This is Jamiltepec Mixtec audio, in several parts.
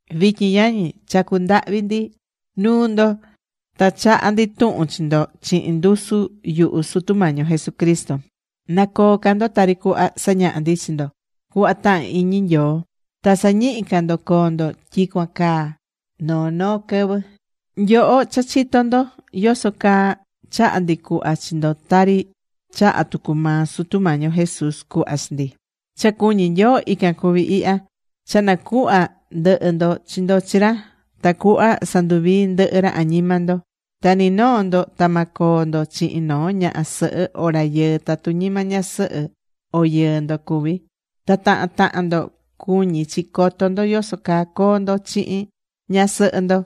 Vityin yañi, chacú ndahvi ndi nuu ndo ta chahá ndi tuhun chi ndo chihin ndusu yuhu Sutu Mañi yo Jesucristo, na coo ca ndo tari cuhva sañaha̱ ndi chi ndo, cuhva tahán iñi Nyoo. Ta sa̱ñihi ca ndo coo ndo tyicuan caa noo noo quɨvɨ. Nyoho cha chitó ndo yoso caa chaha̱ ndi cuhva chi ndo tari chaha̱ tucu maa Sutu Mañi yo Jesús cuhva chi ndi. Cha cuñí Nyoo, ican cuví ihya: Cha na̱cuhva ndɨhɨ ndo chi ndo chi ra tacuhva sanduvii ndɨhɨ ra añima ndo. Ta ni noo ndo ta ma coo ndo chihin noo ñaha sɨhɨ o rayɨɨ tatu ñima ñasɨhɨ o yɨɨ ndo cuví. Ta tahan tahan ndo cuñí chi coto ndo yoso caa coo ndo chihin ñasɨhɨ ndo.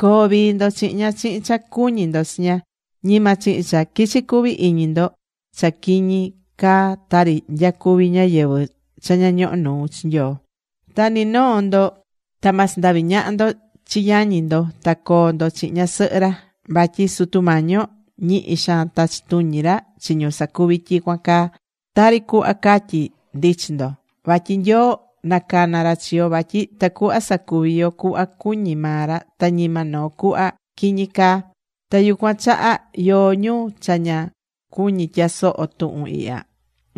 Co̱o vii ndo chihin ña chihin cha cuñí ndo chi ña. Ñima chihin cha quichi cuvi iñi ndo cha quiñi caa tari nyacuví ñáyɨvɨ cha ña ñohó nuu chi Nyoo. Ta ni noo ndo ta ma sandavi ñaha ndo chi yañi ndo ta coo ndo chihin ñasɨhɨ ra. Vatyi Sutu Mañi yo, ñihi xaan tachí tuñi ra chi ñu sacuví tyicuan caa, tari cuhva catyi̱ ndi chi ndo. Vatyi Nyoo nacana̱ ra chi yo vatyi tacuhva sacuvi yo cuhva cuñí maa ra, ta ñima noo cuhva quiñi caa. Ta yucuan chaha yóó ñu cha ña cuñí tyasoho tuhun ihya,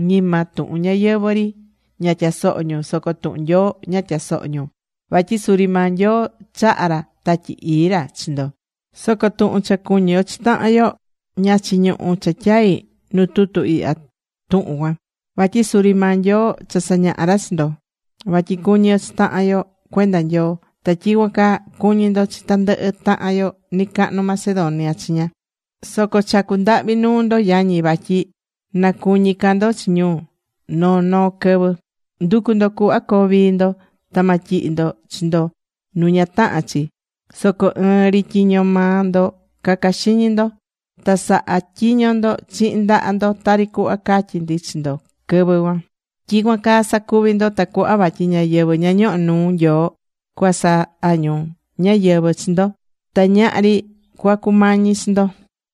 ñima tuhun ñáyɨvɨ ri ña tyasohó ñu, soco tuhun Nyoo ña tyasohó ñu. Vatyi suri maa Nyoo chaha̱ ra Tatyi Ii ra chi ndo. Soco tuhun cha cuñí yo chi tahan yo, ña chiñuhú cha tyai nu tutu ihya tuhun cuan. Vatyi suri maa Nyoo cha sañaha̱ ra chi ndo vatyi cu̱ñi yo chi tahan yo cuenda Nyoo. Ta tyicuan caa cuñí ndo chi tandɨhɨ tahan yo nɨcahnu Macedonia chiña. Soco chacú ndahvi nuu ndo yañi, vatyi na cuñi ca ndo chi ñu noo noo quɨvɨ. Ndu̱cu ndo cuhva coo vii ndo. Ta ma tyihi ndo chi ndo nu ña tahán chi, soco ɨɨn ri tyiño maa ndo ca̱ca xiñi ndo. Ta sa̱ha tyiño ndo chihin ndaha ndo tari cuhva catyi̱ ndi chi ndo quɨvɨ cuan. Tyicuan caa sa̱cuvi ndo tacuhva vatyi ñáyɨvɨ ña ñohó nuu Nyoo cuasaha ñu ñáyɨvɨ chi ndo. Ta ñahri cuacumañi chi ndo.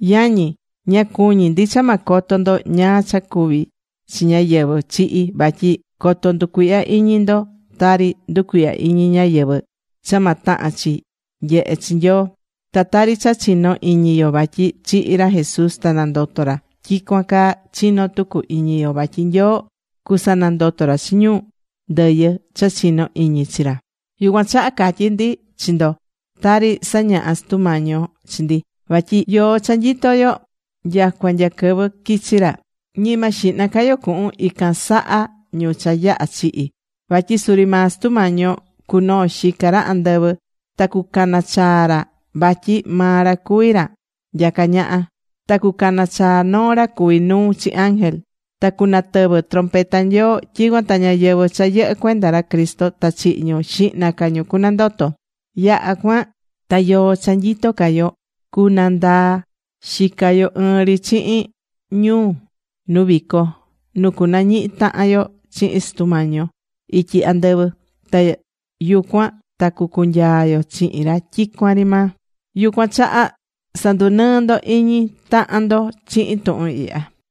Yañi, ña cuñí ndi cha ma coto ndo ñáá cha cuví chi ñáyɨvɨ chihi̱, vatyi coto nducuihya iñi ndo tari nducuihyá iñi ñáyɨvɨ cha ma tahan chi nyehe chi Nyoo. Ta tari cha chinó iñi yo vatyi chihi̱ ra Jesús ta nandoto̱ ra, tyicuan caa chinó tucu iñi yo vatyi Nyoo cusanandoto ra chi ñu ndɨyɨ cha chinó iñi chi ra. Yucuan chaha catyí ndi chi ndo tari sañaha̱ Sutu Mañi yo chi ndi. Vatyi yoó cha nyitó yo nyacua nya quɨvɨ quichi ra, ñima xihna ca yo cuhun ican saha ñu cha yaha̱ chihi̱. Vatyi suri maa Sutu Mañi yo cunoo xica ra andɨvɨ, ta cucana chaa ra vatyi maa ra cuví ra nyacá ñaha. Ta cucana chaa noo ra cuví nuu chi ángel. Ta cunatɨvɨ trompeta Nyoo. Tyicuan ta ñáyɨvɨ cha yɨhɨ́ cuenda ra Cristo ta chihi ñu, xihna ca ñu cunandoto. Yaha̱ cuan ta yoó cha nyitó ca yo cundaa xica yo ɨɨn ri chihin ñu nu vico, nu cunañihi tahan yo chihin Sutu Mañi yo ityi andɨvɨ. Ta yucuan ta cucunyaa yo chihin ra tyicuan ri maa. Yucuan chaha sa̱ndunɨɨ ndo iñi tahan ndo chihin tuhun ihya.